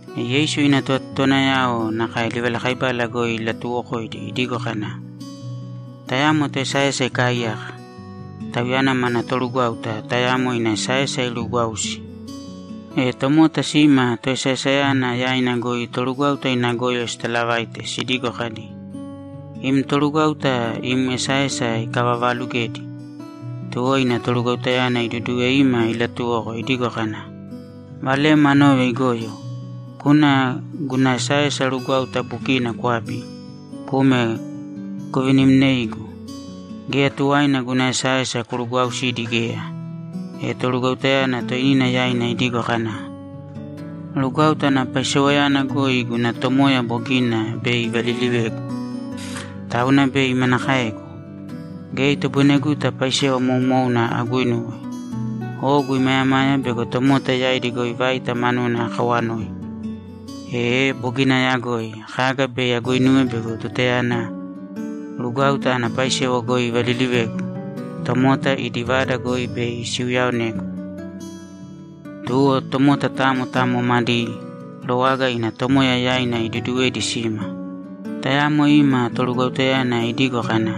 E Yeisu ina tovatotowanayao nakae livalakaibala goi ilatuuwokoidi idigo kana, ‘Tayamo toesaesa ikaaiyaka. Tauyana mana torugwáuta tayamo ina esaesa iruugwausi. E tomota sima toesaesayana yaina goi torugwáuta ina goyo sitalavaite sidigo kadi, “Im torugwáuta im esaesa ikavavaalugedi.” Tuwo ina torugwautayana iduduwe ima ilatuwoko idigo kana, “Valem anove igoyo. Kūna guna esaesa rugwáuta bukina kwābi kūme kuvinimnēigu! Geya tuwaina guna esaesa kurugwausidi geya.” E torugwautayana toinina yaina idigo kana, “Rugwáuta ana paisewayana goi guna tomoya bogina bei ivalilivegu, tauna bei manakaegu? Geya itoboineguta paisewa moumouna aguinuwe. Ogu imayamaya bego tomota yaidi goi vaita manuna akawanoi. Ee bogina ayagoi kaga bei aguinuwe bego tutayana rugwáuta ana paisewa goi ivalilivegu, tomota idi vada goi bei siuyaonegu.” Tuwo tomota tamo tamo madi rowaga ina tomoya yaina iduduwedi sima. Tayamo ima torugwautayana idigo kana,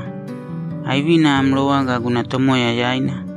“Aivina am rowaga guna tomoya yaina?”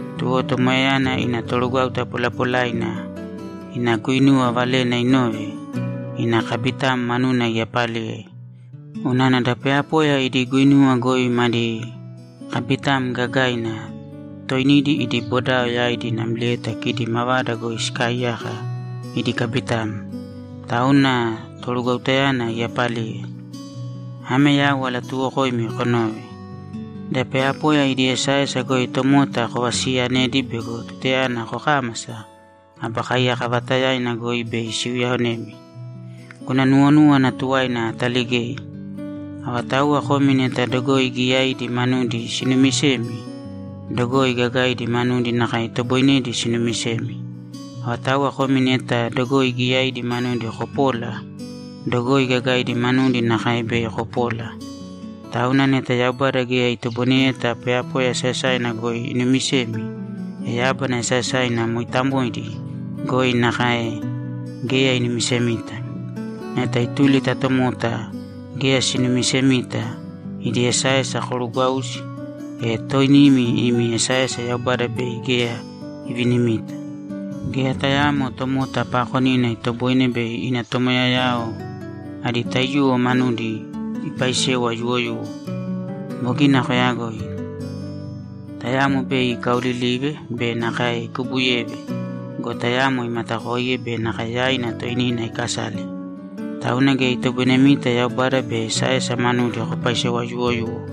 Tuwo tomoyayana ina torugwáuta polapolaina ina guinuwa valena inove, ina kabitam manuna iyapaliye. Unana da poyapoya idi guinuwa goi madi kabitam gagaina toinidi idi bodao yaidi namlieta kidi mavada goi sikaaiyaka idi kabitam. Tauna torugwautayana iyapaliye. Ame yau alatuuwokoimi konōve: Da poyapoya idi esaesa goi tomota kovasiyanēdi bego tutayana kokámasa, aba kaiyaka vaatayaina goi bei siuyaonemi. Guna nuwonúwana tuwaina ataligei. Avatauwa komi neta dogoi giyaidi manudi sinumisemi, dogoi gagaidi manudi nakae itoboinedi sinumisemi. Avatauwa komi neta dogoi giyaidi manudi kopola, dogoi gagaidi manudi nakae bei kopola. Tauna neta Yaubada geya itoboineyeta poyapoya esaesaina goi inumisemi, e yábana esaesaina mooitamoidi goi nakae geya inumisemita. Neta ituli ta tomota geya sinumisemita idi esaesa korugwausi, e toinimi imi esaesa Yaubada bei geya ivinimita. Geya tayaamo tomota paakonina itoboine bei ina tomoyayao adi taiyuwo manudi ipaisewa yuwoyuwo. Bogina koyagoi. Tayamo bei ikaolilive be nakae ikubuyeve go, tayamo imatakoiye be nakae yaina toinina ikasale. Tauna geya itoboinemita Yaubada be esaesa manudi kopaisewa yuuwoyuwo.’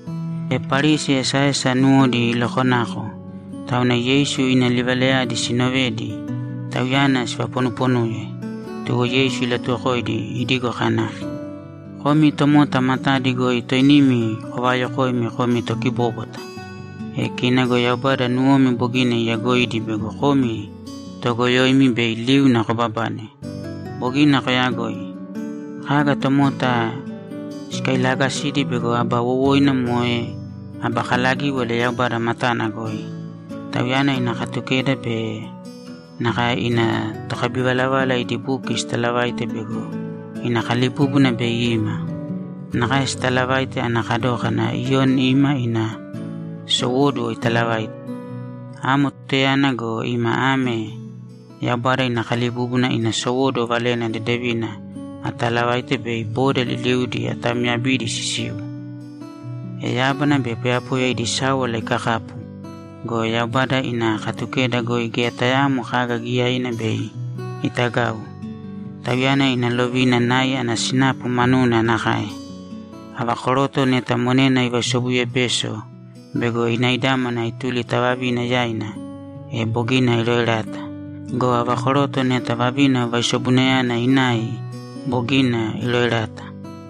E Parisi esaesa nuwodi ilokonako, tauna Yeisu ina livalayadi siinovedi, Tauyana sivaponuponuye. Tuwo Yeisu ilatuwokoidi idigo kana, ‘Komi tomota matadi goi toinimi kovayokoimi komi tokibóbwata. E kina go Yaubada nuwomi bogina iyagoidi bego komi toogoyoimi bei liuna kobabane. Bogina koyagoi. Kaga tomota sikailaagasidi bego aba wowoina moe aba kalagíwala Yaubada matana goi. Tauyana ina Katukeda be nakae ina tokabivalavala idi buki sitalavaite bego ina kalibúbuna bei ima. Nakae sitalavaite ana kadókana Iyoni ima ina sowóduwo italavaite. Amo tutayana go, ima ame Yaubada ina kalibúbuna ina sowóduwo Valena Dedevina atalavaite bei boda liliudi atamyabidi sisiu. E yábana be poyapoya idi sáwala ikakapu go, Yaubada ina Katukeda goi geya tayaamo kaga giyaina bei itagau. Tauyana ina lovina nai ana sinapu manuna nakae. Ava koroto neta monena ivaisobuyebeso bego inaidámana ituli ta vavina yaina, e bogina iroerata. Go ava koroto neta vavina vaisobunayana inai, bogina iroerata.’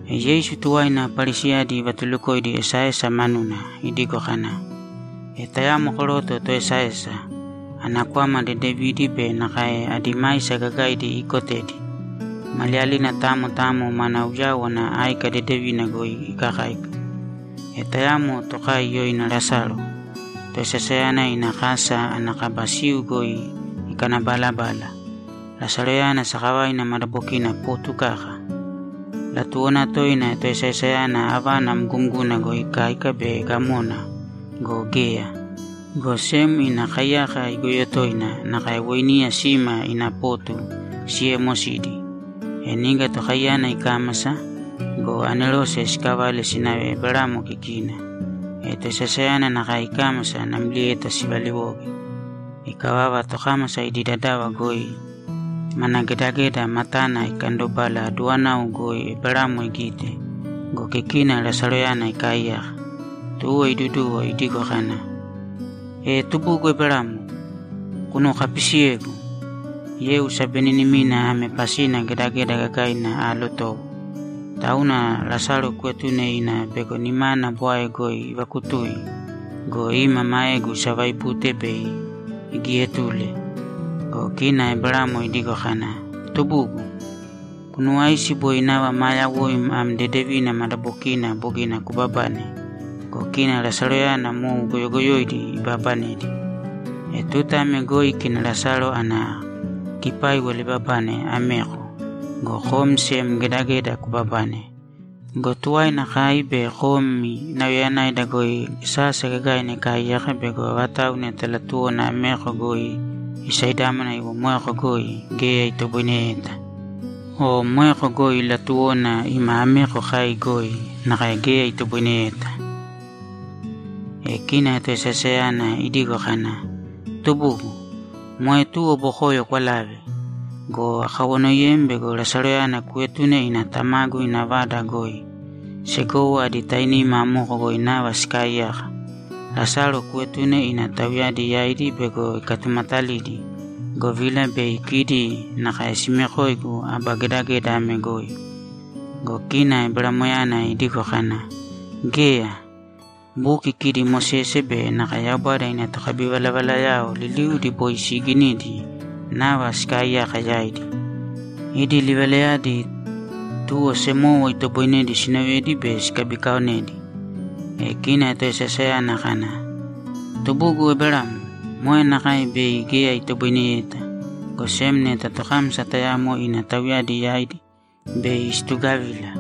E Yeisu tuwaina Parisiyadi ivatulukoidi esaesa manuna idigo kana, ‘E tayamo koroto toesaesa. Ana kwama dedevidi be nakae adi maisa gagaidi iikotedi. Maliyalina tamo tamo mana uyáwana áika dedevina goi ikakáika. E tayamo tokai yoina Lasalo toesaesayana ina kasa ana kaba siu goi ikanabalabala. Lasaloyana sakavaina madabokina potu kaka. Latuwona toina toesaesayana avana mgumguna goi ikáika bei gamona go, geya. Go sem ina kaiyaka igoyo toina nakae weiniya sima ina potu siyeemosidi. E niga tokaiyana ikámasa go, anerose sikavale sinave Eberamo kikina. E toesaesayana nakae ikámasa namlieta sivaliwoge. Ikavava, tokámasa idi dadava goi mana gedageda matana ikandolaga aduwanau goi Eberamo igite go, kikina Lasaloyana ikaaiyaka. Tuwo iduduwo idigo kana, “E tubugu Eberamo, kunuwokapisiyēgu. Yeu sabeninimina ame pasina gedageda gagaina aalotowo. Tauna Lasalo kuetūne ina bego nimana bwae goi ivakutui go, ima maegu isavaibute bei igietule.” Go kina Eberamo idigo kana, “Tubugu, kunuwāisi boi nava maa yawoim am dedevina madabokina bogina kubabane go, kina Lasaloyana mou goyogoyoidi ibabanedi. E tuta ame goi kina Lasalo ana kipáiwala ibabane ameko go, kom sem gedageda kubabane. Go tuwaina kai be komi nauyayanaida goi sasa gagaina ikaaiyaka bego avatau neta latuwona ameko goi isaidámana iwo moeko goi, geya itoboineyeta. O moeko goi latuwona ima ameko kai goi, nakae geya itoboineyeta.” E kina toesaesayana idigo kana, “Tubugu, moe tuwo bokoyo kwalāve. Go akawanoiyem bego Lasaloyana kuetune ina tamagu ina vada goi. Segowo adi tainima amoko goi nava sikaaiyaka. Lasalo kuetūne ina tauyadi yaidi bego ikatumatalidi, govila bei kidi nakae simekoigu aba gedageda ame goi.” Go kina Eberamoyana idigo kana, “Geya. Buki kidi Mosese be nakae Yaubada ina tokabivalavalayao liliudi boi siiginidi nava sikaaiyaka yaidi. Idi livalayadi, tuwo semowo itoboinedi siinovedi be sikabikaaonedi.” E kina toesaesayana kana, “Tubugu Eberamo, moe nakae bei geya itoboineyeta, go sem neta tokámasa tayamo ina tauyadi yaidi bei situgavila.”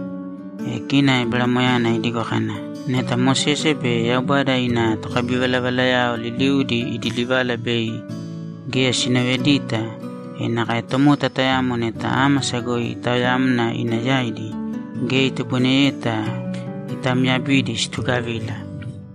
E kina Eberamoyana idigo kana, “Neta Mosese be Yaubada ina tokabivalavalayao liliudi idi livala bei geya sinovedita, e nakae tomota tayamo neta ámasa goi itaoyamna ina yaidi, geya itoboineyeta itamyabidi situgavila.”’